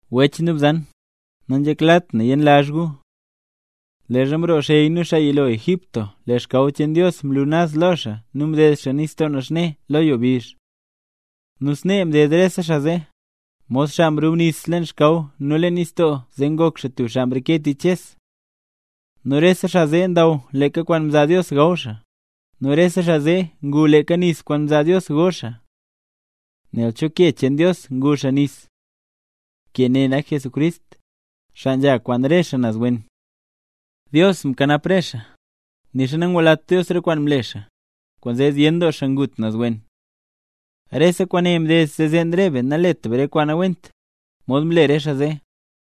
Wech nu bzan, nanzheklat na yenlazh gu: Leezha mroo re xey nu, xaa yilo, Egipto lee xkaw cheen Dios mlu naz lo xaa nu mded xaa Nistoo Naxne lo yo bizh. Nu snee mded rese xaa zee, modxa mrubnis xaa leen xkaw nu leen nistoo zee ngok xaa tub xaa mreke tich Ches. Nu rese xaa zee ndaw leeka kwaan mzaa Dios gaw xaa, nu rese xaa zee ngu leeka nis kwaan mzaa Dios go xaa. Nel cho ke cheen Dios ngu xaa nis. Ke ne nak Jesucrist, xaa nzha kwaan re xaa naz wen. Mkanap Dios re xaa, nixa nangulat Dios re kwaan mle xaa, kwaanzee zyen doo xaa ngut naz wen. Rese kwaane mded zee zeen re be nalet be re kwaan nawent, mod mle re xaa zee.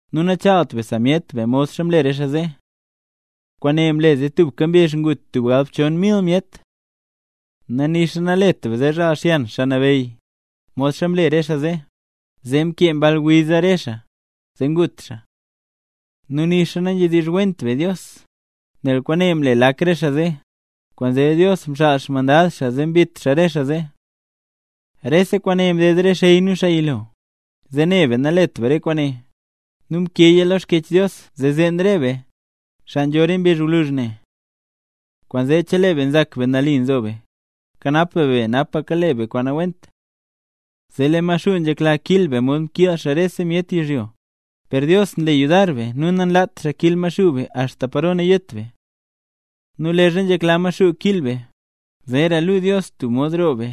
Nu nachaalt be sa myet be, mod mle re xaa zee. Kwaane mle zee tubka mbizh ngut tub galbchon mil myet. Nu nixa nalet be zee zhaal xyan Xaa Nabeyy, modxa mle re xaa zee, zee mkee mball wiza re xaa, zee ngut xaa. Nu nixa nanzhedizh went be Dios, nel kwaane mle lak re xaa zee, kwaanzee Dios mxaal xmandad xaa zee mbit xaa re xaa zee. Rese kwaane mded re xey nu xaa yilo, zee ne be nalet be re kwaane, nu mkeeya lo Xkyech Dios zee zeen re be, xaa nzho re mbizh gwluzh ne. Kwaanzee chelee be nzak be nali nzo be, kanapka be be napaka le be tub kwaan nawent. Zee lee Maxuu nzhekla kiil be mod nkiil xaa rese myet yizhyo, per Dios nle yudar be nu nanlaat xaa kiil Maxuu be axta paro nayet be. Nu leezha nzhekla Maxuu kiil be, zeera luu Dios tub mod roo be,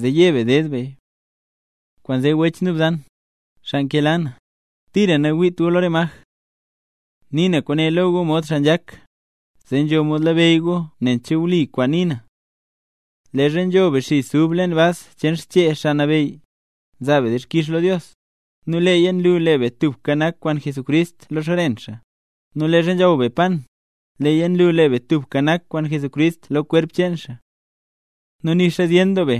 zee ye be ded beya. Kwaanzee wech nu bzan, xaa nkela na, tira nawiit gu lo re maj. Nii na kwaane lo gu mod xaa nzhak, zee nzho mod labeyy gu nen che wli kwaan nii na. Leezha nzho be xis ub leen bas cheen xchee Xaa Nabeyy, nzaa be dixkix lo Dios, nu leeya nlu lee be tubka nak kwaan Jesucrist lo xren xaa; nu leezha nzhaw be pan, leeya nlu lee be tubka nak kwaan Jesucrist lo kwerp cheen xaa. Nu nixa zyen doo be,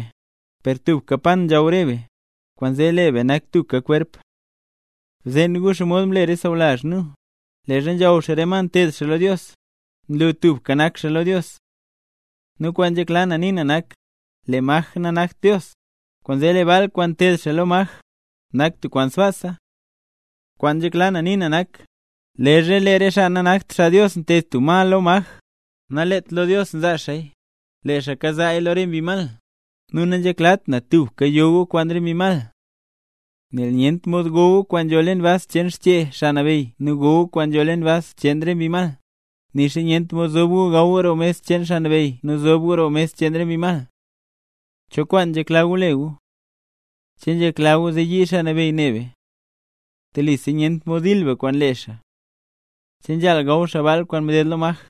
per tubka pan nzhaw re be, kwaanzee lee be nak tubka kwerp. Bzeen gu xomod mle re sawlazh nu; leezha nzhaw xaa re ma mteed xaa lo Dios, nlu tubka nak xaa lo Dios. Nu kwaan nzhekla na nii na nak, lee maj nanakt dios, kwaanzee lee baal kwaan nteed xaa lo maj, nebse nak tub kwaan sbaasa. Kwaan nzhekla na nii na nak, leezha lee re xaa nanakt xaa Dios nteed tub ma lo maj, naleet lo Dios nzaa xaaya, lee xaa kazaaya lo re mbi mal, nu nanzheklat na tubka yo gu kwaan mbi mal. Nel nyent mod go gu kwaan nzho leen bas cheen xchee Xaa Nabeyy nu go gu kwaan nzho leen bas cheen re mbi mal, nixa nyent mod zob gu gaw gu roo mes cheen Xaa Nabeyy nu zobka gu roo mes cheen re mbi mal. ¿Cho kwaan nzhekla gu le gu? ¿Che nzhekla gu zee yii Xaa Nabeyy ne be? ¡Telisa nyent mod dil be kwaan lee xaa! ¿Che nzhaal gaw xaa baal kwaan mded lo maj?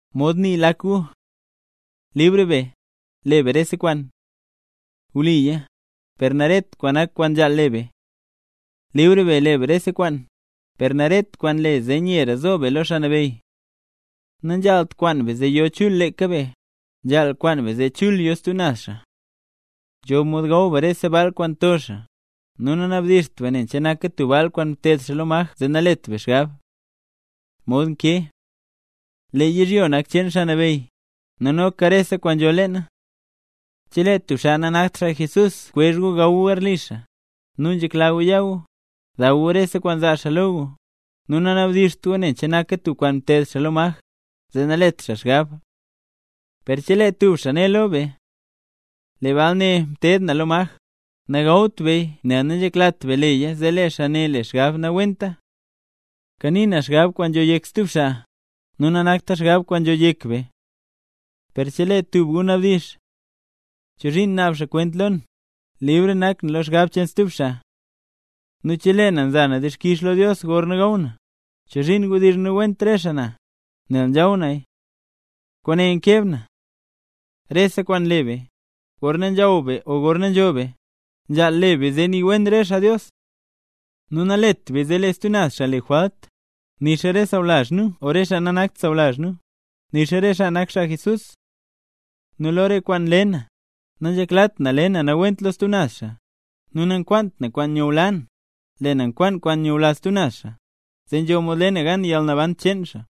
Mod nii lak gu: “Libr be, le be rese kwaan”. Wliya, per naret kwaan nak kwaan nzhaal le be. “Libr be le be rese kwaan”, per naret kwaan nle zee nyera zo be lo Xaa Nabeyy. Nanzhaalt kwaan be zee yo chul leeka be, nzhaal kwaan be zee chul yo stub naz xaa. Nzho mod gaw be rese baal kwaan nto xaa, nu nanabdizht be nen che naka tub baal kwaan mteed xaa lo maj zee nalet be xgab. Mod nkee: Lee yizhyo nak cheen Xaa Nabeyy, nu noka rese kwaan nzho leena. Chelee tub xaa nanakt xaa Jesús kwezh gu gaw gu garli xaa, nu nzhekla gu ya gu, daw gu rese kwaan zaa xaa lo gu, nu nanabdizht gu nen che naka tub kwaan mteed xaa lo maj, zee nalet xaa xgab. Per chelee tub xaa né lo be: “Lee baal ne mteed na lo maj”, nagawt beya nel nanzheklat be leya, zee lee xaa ne le xgab nawenta. Kanii na xgab kwaan nzho yek stub xaa, nu nanakta xgab kwaan nzho yek be. Per chelee tub gu nabdizh: “¿Chozhiin naab xaa kwent lo na, libr nak na lo xgab cheen stub xaa? Nu chelee na nza na dixkix lo Dios gorna gaw naya, ¿chozhiin wdizh nawent re xaa na, nel nzhaw naya?” Kwaane nkeb na: Rese kwaan nle be, gorna nzhaw be o gorna nzho be, nzhaal le beya zee nii wen re xaa Dios. Nu nalet be zee lee stub naz xaa le jwalt, nixa re sawlazh nu o re xaa nanakt sawlazh nu, nixa re xaa nak xaa Jesús. Nu lo rese kwaan nle na, nanzheklat na le na nawent lo stub naz xaa, nu nankwaant na kwaan nyula na, lee na nkwaan kwaan nyula stub naz xaa, zee nzho mod le xaa gan yalnaban cheen xaa.